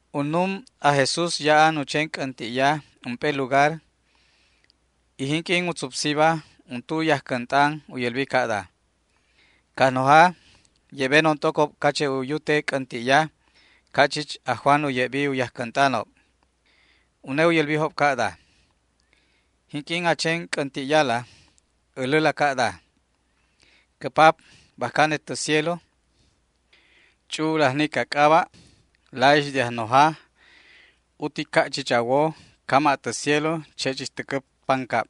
Unnum aj Jesús ya'an u chen c'änti'ya ump'e lugar, y jinq'uin u tzupsiba untu u yajcänt'an u yälbi ca'da: ―Cajnoja, ye'benon t'ocob cache' u yute c'änti'ya ca' chich aj Juan u ye'bi u yajcänt'anob. Une u yälbijob ca'da: ―Jinq'uin a chen c'änti'yala, äläla ca'da: Cä Pap, bajca anet tä cielo, ch'u'ul ajnic a c'aba'. La'ix de Ajnoja, utic ca' chich a wo, cama' tä cielo, che' chich täcä pancab.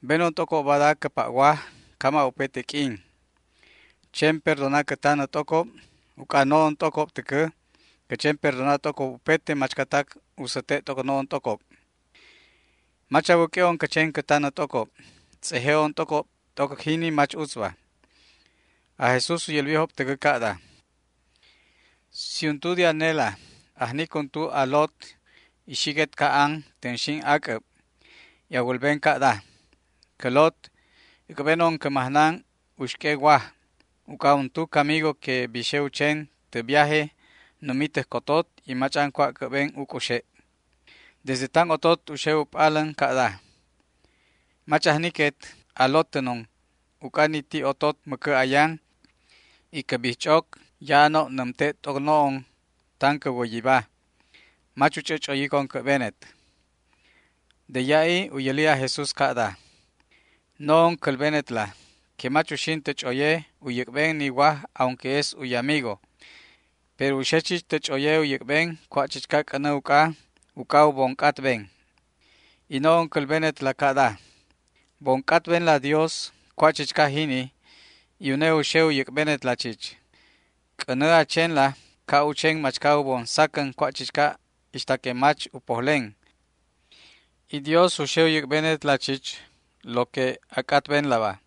Benon t'ocob bada cä pa' waj cama' upete q'uin. Chen perdona cä tanä t'ocob uc'a no'on t'ocob täcä cä chen perdona t'ocob upete machcatac u säte' t'oc no'on t'ocob. Mach a wäq'ue'on cä chen cä tanä t'ocob. Tz'eje'on t'ocob t'oc jini mach utzba. Aj Jesús u yälbijob täcä ca'da: ―Si untu de anela ajnic untu a lot y xiquet ca'an tänxin ac'äb y a wälben ca'da: “Cä lot, äc'benon cä majnan uxq'ue waj, uc'a untu camigo que bixe u chen tä viaje numi täj cotot y mach'an cua' cä'ben u c'uxe'”. Desde tan otot u xe u p'alän ca'da: “Mach ajniquet a lotänon uc'a ni ti' otot mäcä ayan y cä bijch'oc ya'anob nämte' t'oc no'on tan cä wäyiba. Mach u ch'ä ch'oyicon cä'benet”. De ya'i u yäli aj Jesús ca'da: ―No'on cälbenetla que mach uxin tä ch'oye u yäc'ben ni waj aunque es u yamigo. Pero u xe chich tä ch'oye u yäc'ben cua' chichca c'änä uc'a, uc'a u bon c'atben. Y no'on cälbenetla ca'da: Bon c'atbenla Dios cua' chichca jini y une u xe u yäc'benetla chich. C'änä a chenla ca' u chen machca u bon sacän cua' chichca ixta que mach u pojlen, y Dios u xe u yäc'benetla chich lo que a c'atbenlaba.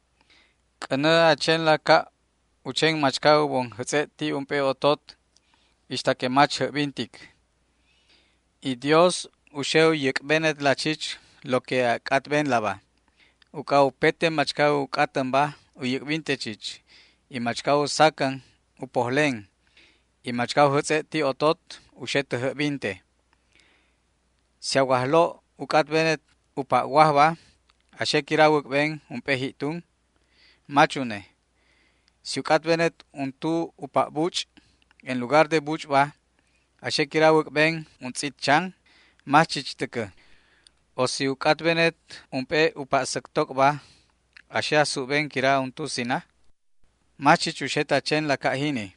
C'änä a chenla ca' u chen machca u bon jätz'e' ti' ump'e otot ixta que mach jäbbintic, y Dios u xe u yäc'benetla chich lo que a c'atbenlaba. Uc'a upete machca u c'atänba u yäc'binte chich, y machca u sacän u pojlen, y machca u jätz'e' ti' otot u xe tä jäbbinte. ’¿Si a wajlo' u c'atbenet u pa' wajba, a xe quira a wäc'ben ump'e ji'tun? Mach une. ¿Si u c'atbenet untu u pa' buch', en lugar de buch'ba, a xe quira a wäc'ben untz'it chan? Mach chich täcä. ¿O si u c'atbenet ump'e u pa' säctoc'ba a xe a súbben quira untu sina? Mach chich uxet a chenla ca' jini.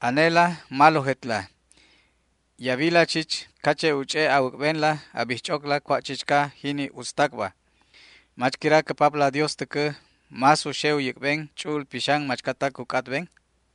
Anela malojetla y a wila chich cache' u ch'e' a wäc'benla a bijch'ocla cua' chichca jini utztacba. ¿Mach quira cä Papla Dios täcä más u xe u yäc'ben Ch'u'ul Pixan machcatac u c'atben?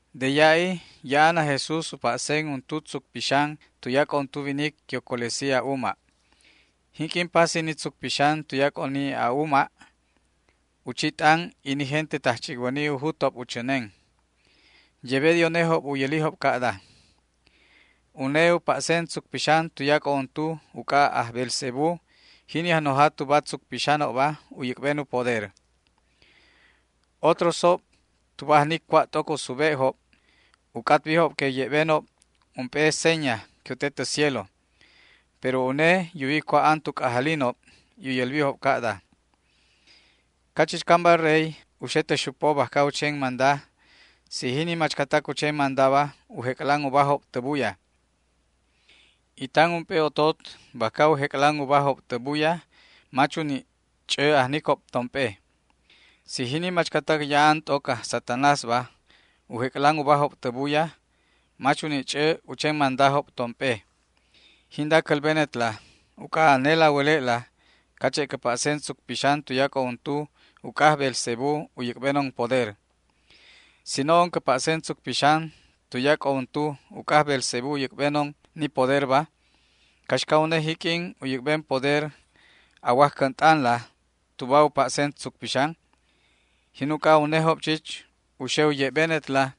De ya'i ya'an aj Jesús u pa'sen untu tzuc pixan tuyac'o untu winic que u colesi a'uma'. Jinq'uin pasi ni tzuc pixan tuyac'o ni a'uma', u chi t'an y ni gente tajch'icwäni u jutob u chänen. Yebe de unejob u yälijob ca'da: ―Une u pa'sen tzuc pixan tuyac'o untu uc'a aj Beelzebú, jini ajnoja tuba tzuc pixanob, u yäc'ben u poder. Otrosjob, tuba ajnic cua' t'oc u sube'job, u c'atbijob que u ye'benob ump'e seña que u te tä cielo. Pero une yuwi cua' an tu c'ajalinob y u yälbijob ca'da: ―Cachichcamba rey u xe tä xupo bajca u chen manda si jini machcatac u chen mandaba u jec'lan ubajob tä buya, y tan ump'e otot bajca u jec'lan ubajob tä buya mach u ni' ch'ä ajnicob tomp'e. Si jini machcatac ya'an t'oc aj Satanásba u jec'lan ubajob tä buya, mach u ni' ch'ä u chen mandajob tomp'e. Jinda cälbenetla uc'a anela a wäle'la cache' cä pa'sen tzuc pixan tuyac'o untu uc'a aj Beelzebú u yäc'benon poder. Si no'on cä pa'sen tzuc pixan tuyac'o untu uc'a aj Beelzebú u yäc'benon ni poderba, ¿caxca une jiq'uin u yäc'ben poder a wajcänt'anla tuba u pa'sen tzuc pixan? Jin uc'a unejob chich u xe u ye'benetla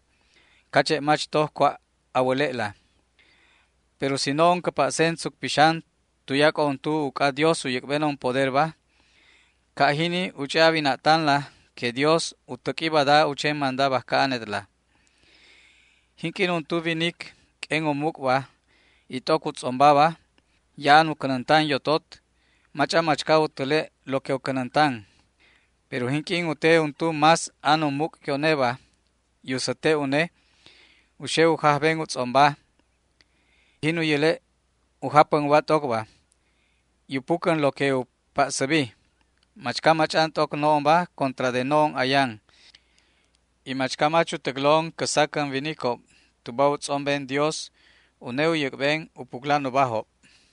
cache' mach toj cua' a wäle'la. Pero si no'on cä pa'sen tzuc pixan tuyac'o untu uc'a Dios u yäc'benon poderba, ca' jini u ch'e' a wina'tanla que Dios u täq'ui bada u chen manda bajca anetla. ’Jinq'uin untu winic q'uen u muc'ba y t'oc u tz'ombaba ya'an u cänäntan yotot, mach'an machca u täle' lo que u cänäntan. Pero jinq'uin u te untu más an u muc' que uneba y u säte' une, u xe u jajben u tz'omba, jin u yäle' u japän uba t'ocba, y u pucän lo que u pa'säbi. ’Machca mach'an t'oc no'onba contra de no'on ayan; y machca mach u täclon cä sacän winicob tuba u tz'omben Dios, une u yäc'ben u puclan ubajob.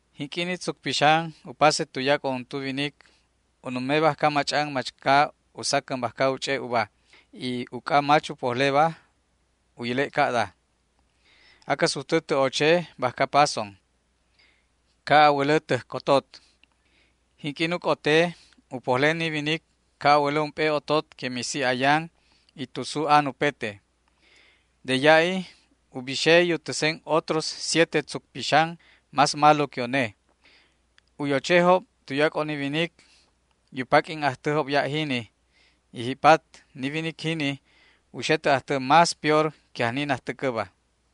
’Jinq'uin ni tzuc pixan u pase tuyac'o untu winic u nume bajca mach'an machca u sacän bajca u ch'e' uba, y uc'a mach u pojleba u yäle' ca'da: “Acä sujtä tä oche bajca pason, ca' a wälä täj cotot”. Jinq'uin u c'ote, u pojlen ni winic ca' a wälä ump'e otot que misi ayan y tusu an upete. De ya'i u bixe y u täsen otros siete tzuc pixan más malo que une. U yochejob tuyac'o ni winic y u paq'uin ajtäjob ya' jini, y ji'pat ni winic jini u xe tä ajtä más peor que ajni najtäcäba.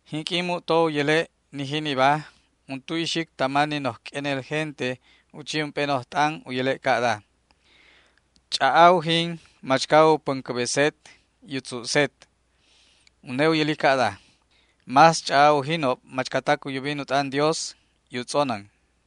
Jinq'uin mu'to u yäle' ni jiniba, untu ixic tama ni noj q'uenel gente u chi ump'e noj t'an u yäle' ca'da: ―¡Ch'a'a ujin machca u päncäbeset, y u tzu'set! Une u yäli ca'da: ―¡Más ch'a'a ujinob machcatac u yubin u t'an Dios, y u tz'onän!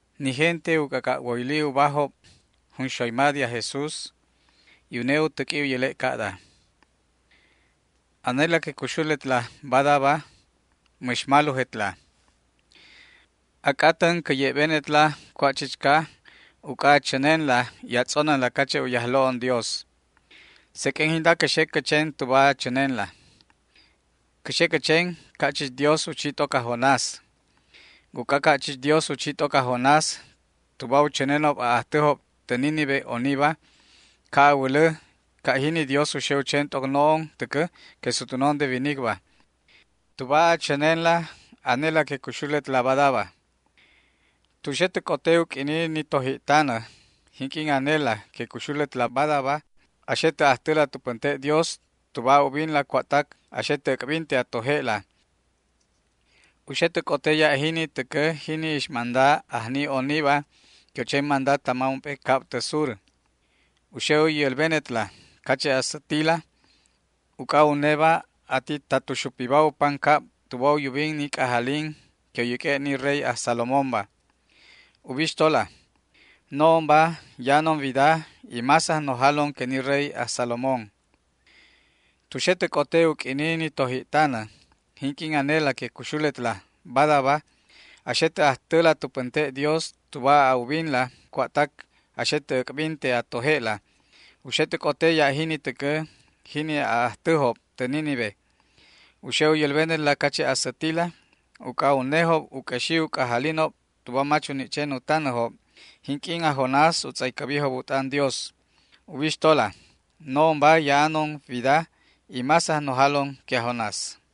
Jinq'uin u c'ac'a' woyli uba ni gente net' net', aj Jesús u täq'ui u yäle' ca'da: ―Anela que cuxuletla badaba mäx malojetla. A c'atän cä ye'benetla cua' chichca uc'a a chänenla y a tz'onänla cache' u Yajlo' Dioson. Seq'uen jinda cä xe cä chen tuba a chänenla. Cä xe cä chen ca' chich Dios u chi t'oc aj Jonás. Uc'a ca' chich Dios u chi t'oc aj Jonás tuba u chänenob a'ajtäjob tä Nínive oniba, ca' a wälä ca' jini Dios u xe u chen t'oc no'on täcä que sutwänon de winicba, tuba a chänenla anela que cuxuletla badaba. Tu xe tä c'ote u q'uini ni toji'tanä, jinq'uin anela que cuxuletla badaba a xe tä ajtäla tu pänte' Dios tuba a ubinla cua'tac a xe tä äc'binte a toje'la, u xe tä c'ote ya' jini täcä jini ixmanda ajni oniba que u chen manda tama ump'e cab tä sur. U xe u yälbenetla cache' a sätila uc'a uneba ati ta tu xupiba u pancab tuba u yubin ni c'ajalin que u yäq'ue' ni rey aj Salomónba. Ubixtola, no'onba ya'anon wida, y más ajnojalon que ni rey aj Salomón. Tu xe tä c'ote u q'uini ni toji'tanä, jinq'uin anela que cuxuletla badaba a xe tä ajtäla tu pänte' Dios tuba a ubinla cua'tac a xe tä äc'binte a toje'la, u xe tä c'ote ya' jini täcä jini a'ajtäjob tä Nínive. U xe u yälbenetla cache' a sätila uc'a unejob u q'uexi u c'ajalinob tuba mach u ni' chen u tanäjob jinq'uin aj Jonás u tz'aycäbijob u t'an Dios. Ubixtola, no'onba ya'anon wida, y más ajnojalon que aj Jonás.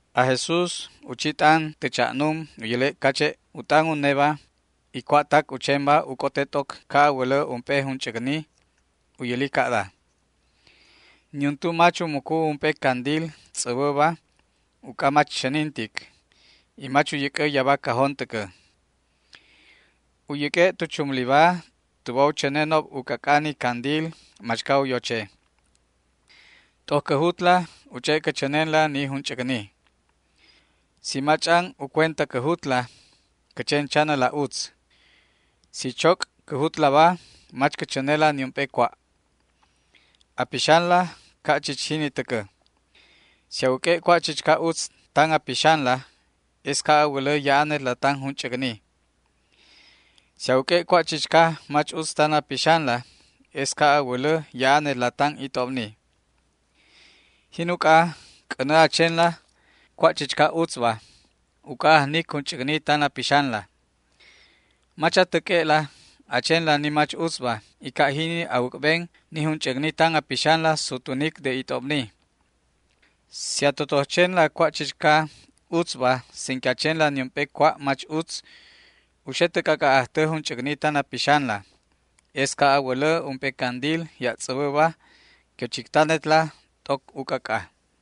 Aj Jesús u chi t'an tä cha'num u yäle' cache' u t'an uneba y cua'tac u chenba u c'ote t'oc ca' a wälä ump'e junch'äcni. U yäli ca'da: ―Niuntu mach u mucu ump'e candil tz'äbäba uc'a mach chänintic, y mach u yäc'ä yaba cajón täcä. U yäq'ue' tu chumliba tuba u chänenob u c'ac'a ni candil machca u yoche. T'oc cä jutla u ch'e' cä chänenla ni junch'äcni. Si mach'an u cuenta cä jutla cä chen chanäla utz. Si choc' cä jutlaba mach cä chänela niump'e cua'. A pixanla ca' chich jini täcä. Si a wäq'ue' cua' chichca utz tan a pixanla, es ca' a wälä ya'anetla tan junch'äcni. Si a wäq'ue' cua' chichca mach utz tan a pixanla es ca' a wälä ya'anetla tan it'obni. Jin uc'a, c'änä a chenla cua' chichca utzba uc'a ajnic junch'äcni tan a pixanla. Mach a täq'ue'la a chenla ni mach utzba y ca' jini a wäc'ben ni junch'äcni tan a pixanla sutwänic de it'obni. Si a totoj chenla cua' chichca utzba sin que a chenla niump'e cua' mach utz, u xe tä c'ac'a' ajtä junch'äcni tan a pixanla. Es ca' a wälä ump'e candil ya' tz'äbäba que u chictanetla t'oc u c'ac'a.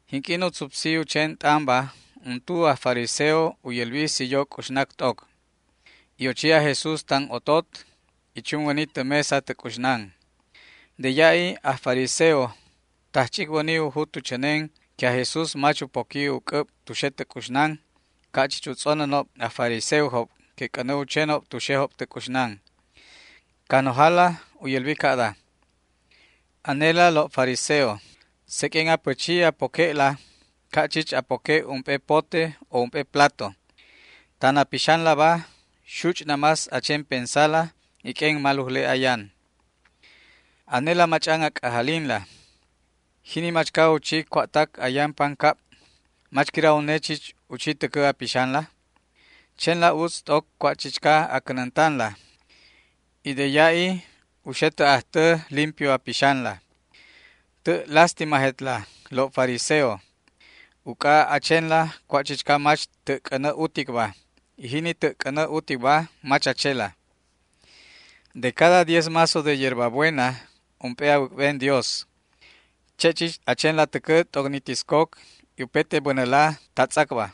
Jinq'uin u tzupsi u chen t'anba untu aj fariseo u yälbi si yo c'uxnac t'oc, y ochi aj Jesús tan otot y chunwäni tä mesa tä c'uxnan. De ya'i aj fariseo tajch'icwäni u jut u chänen que aj Jesús mach u poqui u c'äb tu xe tä c'uxnan, ca' chich u tz'onänob aj fariseojob que c'änä u chenob tu xejob tä c'uxnan. Cajnojala u yälbi ca'da: ―Anela lo' fariseo, seq'uen a pächi a poque'la ca' chich a poque' ump'e pote o ump'e plato. Tan a pixanlaba xuch' namás a chen pensala y q'uen malujle ayan. Anela mach'an a c'ajalinla. Jini machca u chi cua'tac ayan pancab, ¿mach quira une chich u chi täcä a pixanla? Chenla utz t'oc cua' chichca a cänäntanla, y de ya'i u xe tä ajtä limpio a pixanla. ’¡Tä' lástimajetla lo' fariseo!, uc'a a chenla cua' chichca mach tä' c'änä uticba, y jini tä' c'änä uticba mach a chela. De cada diez mazo de yerba buena ump'e a wäc'ben Dios. Che' chich a chenla täcä t'oc ni tiscoc y upete bänäla ta tz'acba,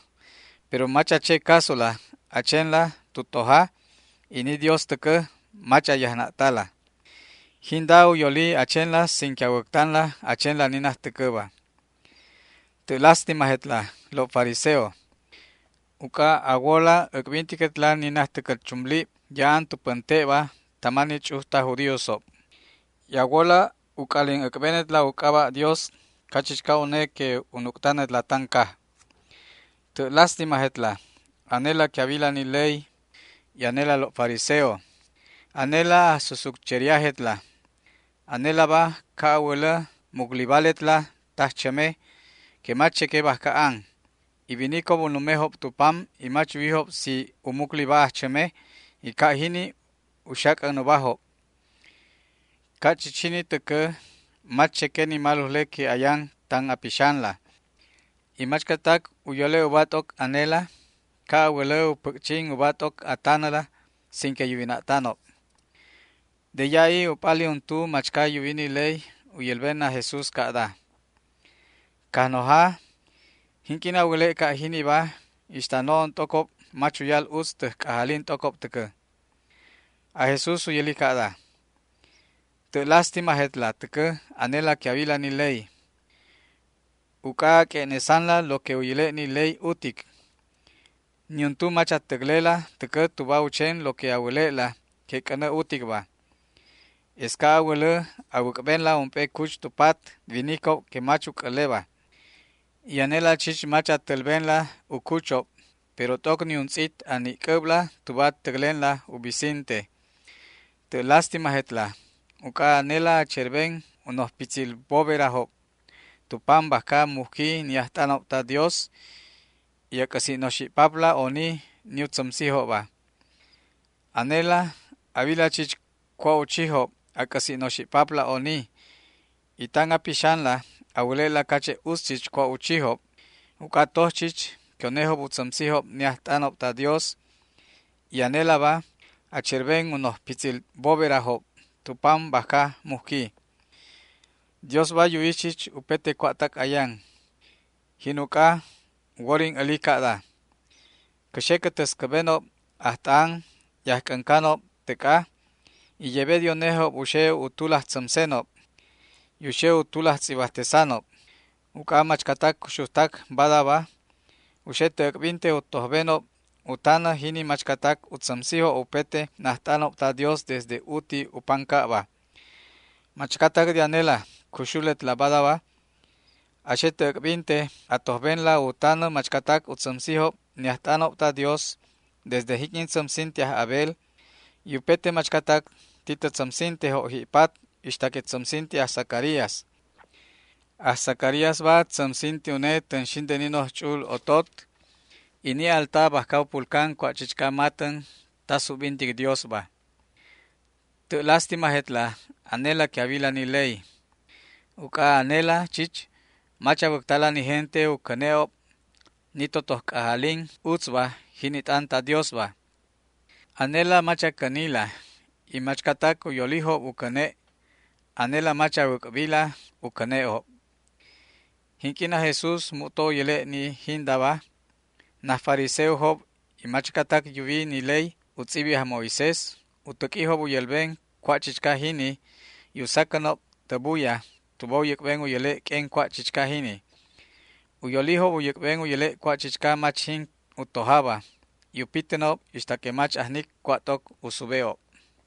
pero mach a che casola a chenla tu toja, y ni Dios täcä mach a yajna'tala. Jinda u yoli a chenla sin que a wäctanla a chenla ni najtäcäba. ’¡Tä' lástimajetla lo' fariseo!, uc'a a wola äc'bintiquetla ni najtäcäl chumlib ya'an tu pänte'ba tama ni ch'uj taj judíosob y a wola u c'alin äc'benetla u c'aba' Dios cachichca une que u nuc'tanetla tan caj. ’¡Tä' lástimajetla anela que a wila ni ley, y anela lo' fariseo! ¡Anela ajsusutcheriajetla! Anelaba ca' a wälä muclibaletla tajchäme que mach cheque bajca an, y winicob u numejob tu pam y mach yuwijob si u mucliba ajchäme, y ca' jini u xac'än ubajob. Ca' chich jini täcä mach cheque ni malujle que ayan tan a pixanla, y machcatac u yole' uba t'oc anela, ca' a wälä u päc'chin uba t'oc a tanäla ane sin que yuwina'tanob. De ya'i u p'ali untu machca yuwi ni ley u yälben aj Jesús ca'da: ―Cajnoja, jinq'uin a wäle' ca' jiniba, ixta no'on t'ocob mach uyal utz täj c'ajalin t'ocob täcä. Aj Jesús u yäli ca'da: ―¡Tä' lástimajetla täcä anela que a wila ni ley! Uc'a a q'ue'nesanla lo que u yäle' ni ley utic. Niuntu mach a täclela täcä tuba u chen lo que a wäle'la que c'änä uticba. Es ca' a wälä a wäc'benla ump'e cuch tu pat winicob que mach u c'äleba, y anela chich mach a tälbenla u cuchob, pero t'oc niuntz'it a ni'c'äbla tuba a täclenla u bisinte. ’¡Tä' lástimajetla!, uc'a anela a cherben u noj pitzil boberajob tu pam bajca mujqui ni ajt'anob ta Dios, y a c'äsi' noxi'papla oni ni u tzämsijobba. Anela a wila chich cua' u chijob a c'äsi' noxi'papla oni, y tan a pixanlaba a wäle'la cache' utz chich cua' u chijob, uc'a toj chich que unejob u tzämsijob ni ajt'anob ta Dios y anelaba a cherben u noj pitzil boberajob tu pam bajca mujqui. ’Diosba yuwi chich upete cua'tac ayan. Jin uc'a u worin äli ca'da: “Cä xe cä täscäbenob ajt'anob y ajc'äncanob täc'a, y yebe de unejob u xe u tulaj tzämsenob y u xe u tulaj tz'ibajtesanob”. Uc'a machcatac cuxujtac badaba u xe tä äc'binte u tojbenob u tanä jini machcatac u tzämsijob upete najt'anob ta Dios desde uti u pancab. Machcatac de anela cuxuletla badaba a xe tä äc'binte a tojbenla u tanä machcatac u tzämsijob ni ajt'anob ta Dios desde jinq'uin tzämsinti aj Abel y upete machcatac ti tä tzämsintejob ji'pat ixta que tzämsinti aj Zacarías. Aj Zacaríasba tzämsinti une tänxin de ni noj ch'u'ul otot t'oc bajca an ni alta bajca u pulcan cua' chichca matän ta subbintic Diosba. ’¡Tä' lástimajetla anela que a wila ni ley!, uc'a anela chich mach a wäctala ni gente u cäne'ob ni totoj c'ajalin utzba, jini t'an ta Diosba. Anela mach a cänila, y machcatac u yolijob u cäne'jobba anela mach a wäc'bila u cäne'job. Jinq'uin aj Jesús mu'to u yäle' ni jindaba, naj fariseojob y machcatac yuwi ni ley u tz'ibi aj Moisés u täq'uijob u yälben cua' chichca jini y u sacänob tä buya tuba u yäc'ben u yäle' q'uen cua' chichca jini. U yolijob u yäc'ben u yäle' cua' chichca mach jin u tojaba, y u pitänob ixta que mach ajnic cua' t'oc u sube'ob.